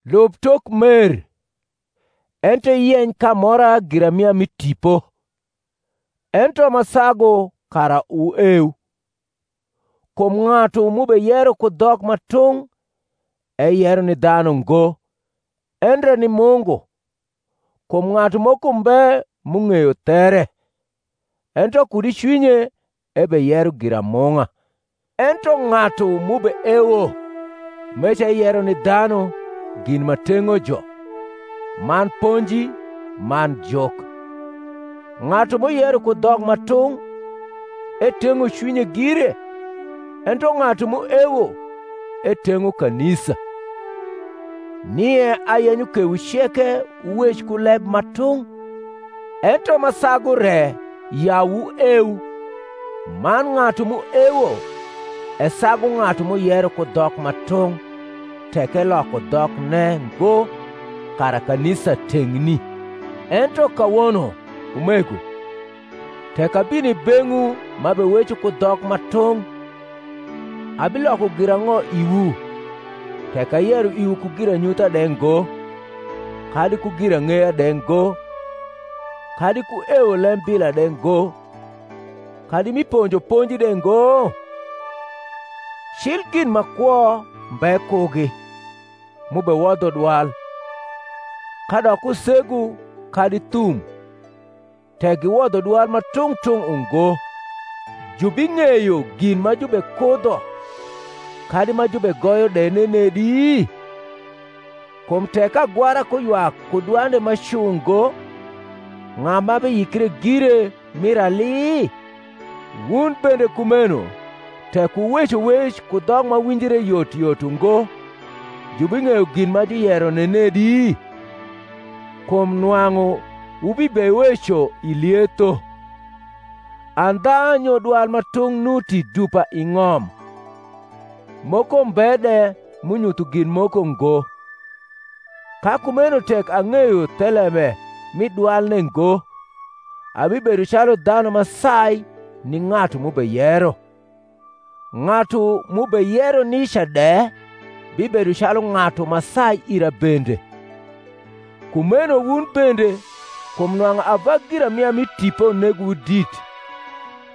Lub tok mer; ento iyeny k’amora giramia mi tipo, ento ma sagu kara wueu. Kum ng’atu m’ubeyero ku dhok ma tung’ eyero ni dhanu ngo, endre ni Mungu; kum ng’atu moko mbe m’ung’eyo there; ento kud i cwinye ebeyero giramung’a. Ento ng’atu m’ubeewo meca eyero ni dhanu gin ma teng’o jo, man ponji, man juk. Ng’atu m’uyero ku dhok ma tung’ eteng’o cwinye gire; ento ng’atu m’uewo eteng’o kanisa. Nie ayenyo kewu ceke wuwec ku leb ma tung’, ento ma sagu re ya wueu: man ng’atu m’uewo esagu ng’atu m’uyero ku dhok ma tung’, tek eloko dhokne ngo, kara kanisa teng’ni. Ento kawono, umego, tek abino i beng’wu m’abeweco ku dhok ma tung’, abiloko girang’o iwu, tek ayero iwu ku giranyutha de ngo, kadi ku girang’eya de ngo, kadi ku ewo lembila de ngo, kadi mi ponjo ponji de ngo? Cil gin ma kwo mbe kugi, m’ubewodho dwal, kadok usegu kadi thum, tek giwodho dwal ma tung’ tung’ ungo, jubing’eyo gin ma jubekudho kadi ma jubegoyo de nenedi? Kum tek agwara kuywak ku dwande ma cu ngo, ng’a ma biyikre gire mir ali? Wun bende kumeno, tek wuweco wec ku dhok ma winjre yot yot ungo, jubing’eyo gin ma juyero nenedi? kum nwang’u wubibeweco i lietho. Andha nyo dwal ma tung’ nuti dupa i ng’om, moko mbe de m’unyutho gin moko ngo. Ka kumeno tek ang’eyo thelembe m’i dwalne ngo, abibedo calu dhanu ma sai ni ng’atu m’ubeyero, ng’atu m’ubeyero nica de bibedo calu ng’atu ma sai ira bende. Kumeno wun bende, kum nwang’u ava giramia mi tipo negowu dit,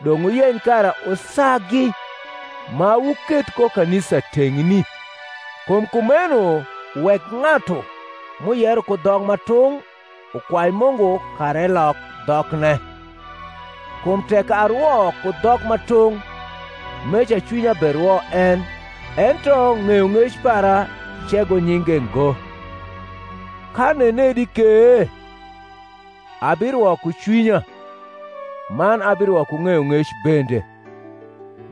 dong’ wuyeny kara wusagi ma wuketh ko kanisa teng’ni. Kum kumeno wek ng’atu m’uyero ku dhok ma tung’ ukwai Mungu kara elok dhokne. Kum tek arwo ku dhok ma tung’, meca cwinya berwo en, ento ng’eyong’ec para cego nyinge ngo. Ka nenedi ke? Abirwo ku cwinya, man abirwo ku ng’eyong’ec bende: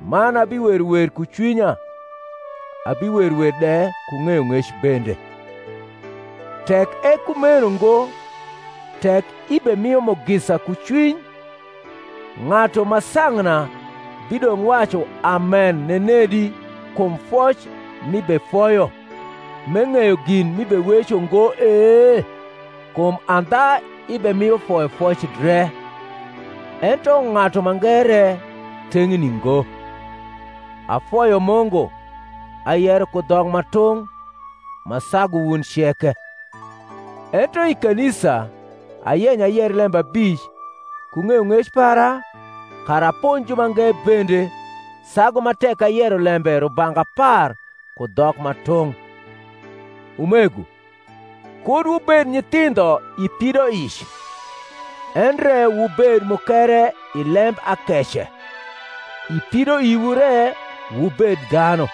man abiwero wer ku cwinya, abiwero wer de ku ng’eyong’ec bende. Tek e kumeno ngo tek ibemio mugisa ku cwiny, ng’atu ma sang’na bidong’ wacu Amen nenedi kum foc m’ibefoyo, m’eng’eyo gin m’ibeweco ngo e? Kum andha ibemio foyofoc dre, ento ng’atu mange re teng’ni ngo. Afoyo Mungu, ayero ku dhok ma tung’ ma sagu wun ceke: ento i kanisa ayenyo ayer lembe abic ku ng’eyong’ec para, kara aponj jumange bende, sagu ma tek ayero lembe rubanga apar ku dhok ma tung’. Umego, kud wubed nyithindho i pidoic: endre wubed mukere i lembakece, i pidoiwu re wubed dhanu.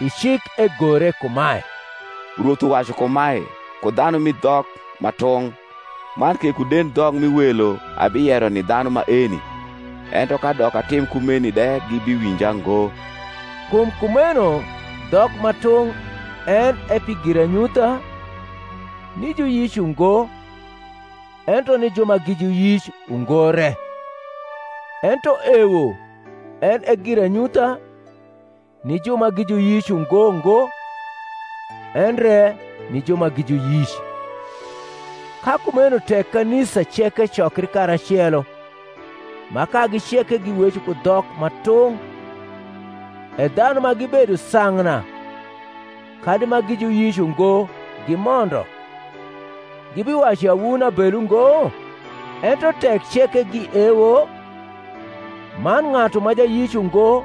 I cik egore kumae, Rwoth uwacu kumae ku dhanu mi dhok ma tung’ man ke ku dendhok mi welo abiyero ni dhanu maeni; ento kadok atim kumeni de gibiwinja ngo. Kum kumeno dhok ma tung’ en e pi giranyutha, ni juyic ungo, ento ni ju ma gi juyic ungo re: ento ewo en e giranyutha, ni ju ma gi juyic ungo ngo, endre ni ju ma gi juyic. Ka kumeno tek kanisa ceke cokri karacelo ma kagi ceke giweco ku dhok ma tung’ e dhanu ma gibedo sang’na kadi ma gi juyic ungo gimondo, gibiwacu ya wun abelu ngo? Ento tek ceke giewo, man ng’atu ma jayic ungo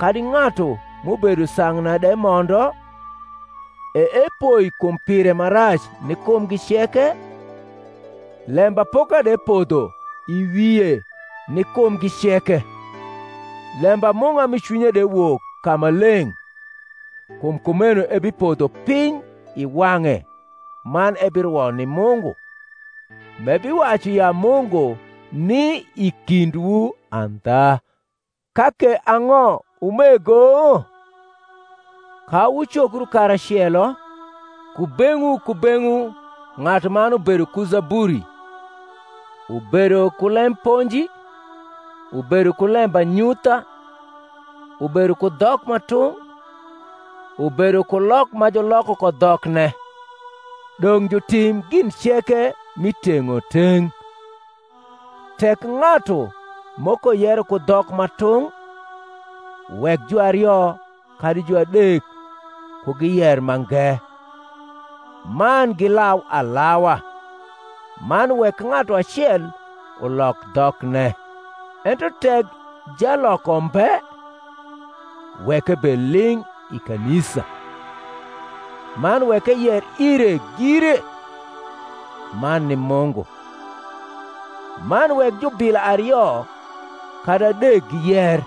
kadi ng’atu m’ubedo sang’na de mondo, e epoi kum pire ma rac ni kumgi ceke, lembapoka de podho i wie ni kumgi ceke; lembamung’a mi cwinye de wok ka ma leng’; kum kumeno ebipodho piny i wang’e man ebirwo ni Mungu, m’ebiwacu ya Mungu ni i kindwu andha. Ka ke ang’o, umego? Ka wucokru karacelo, kubeng’wu kubeng’wu ng’atuman ubedo ku zaburi, ubedo ku lem ponji, ubedo ku lembanyutha, ubedo ku dhok ma tung’, ubedo ku lok ma juloko ko dhokne. Dong’ jutim gin ceke mi teng’oteng’. Tek ng’atu moko yero ku dhok ma tung’, wek juario kadi juadek ku giyer mange, man gilau alawa; man wek ng’atu acel ulok dhokne; ento tek jaloko mbe, wek ebed ling’ i kanisa; man wek eyer ire gire, man ni Mungu. Man wek jubila ario kadi adek giyer,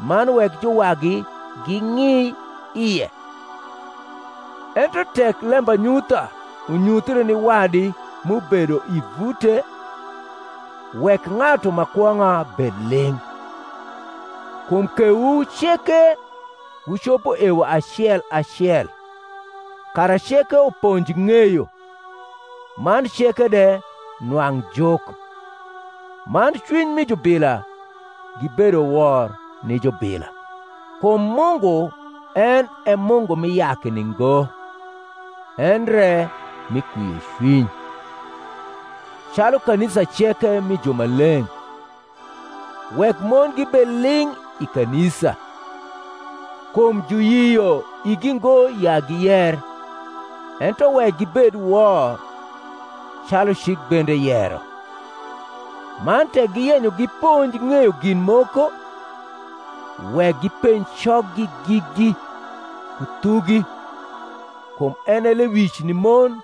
man wek juwagi ging’i ie. Ento tek lembanyutha unyuthie ni wadi m’ubedo i vute, wek ng’atu ma kwong’a bed ling’. Kum kewu ceke wucopo ewo acel acel, kara ceke uponj ng’eyo, man ceke de nwang’ juk; man cwiny mi jubila gibedo wor ni jubila; kum Mungu en e Mungu mi yakni ngo, endre mi kwiocwiny. Calu kanisa ceke mi jumaleng’, wek mon gibed ling’ i kanisa: kum juyio igi ngo ya giyer; ento wek gibed wor, calu cik bende yero. Man tek giyenyo giponj ng’eyo gin moko, wek gipenj coggi gigi ku thugi: kum en e lewic ni mon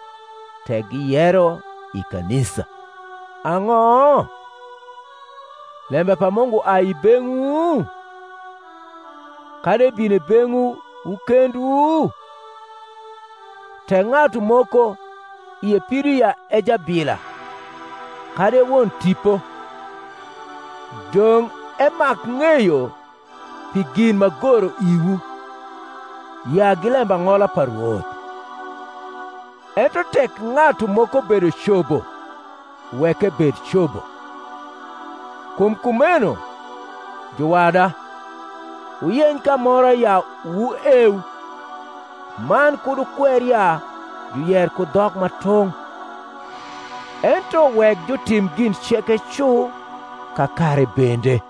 tek giyero i kanisa. Ang’o? lembe pa Mungu ai i beng’wu? kadi ebino i beng’wu wu kendwu? Tek ng’atu moko ie pido ya e jabila, kadi e won tipo, dong’ emak ng’eyo pi gin m’agoro iwu, ya gi lembang’ola pa Rwoth. Ento tek ng’atu moko bedo cobo, wek ebed cobo. Kum kumeno, juwada, wuyeny k’amora ya wueu, man kud wukwer ya juyer ku dhok ma tung’. Ento wek jutim gin ceke cu kakare bende.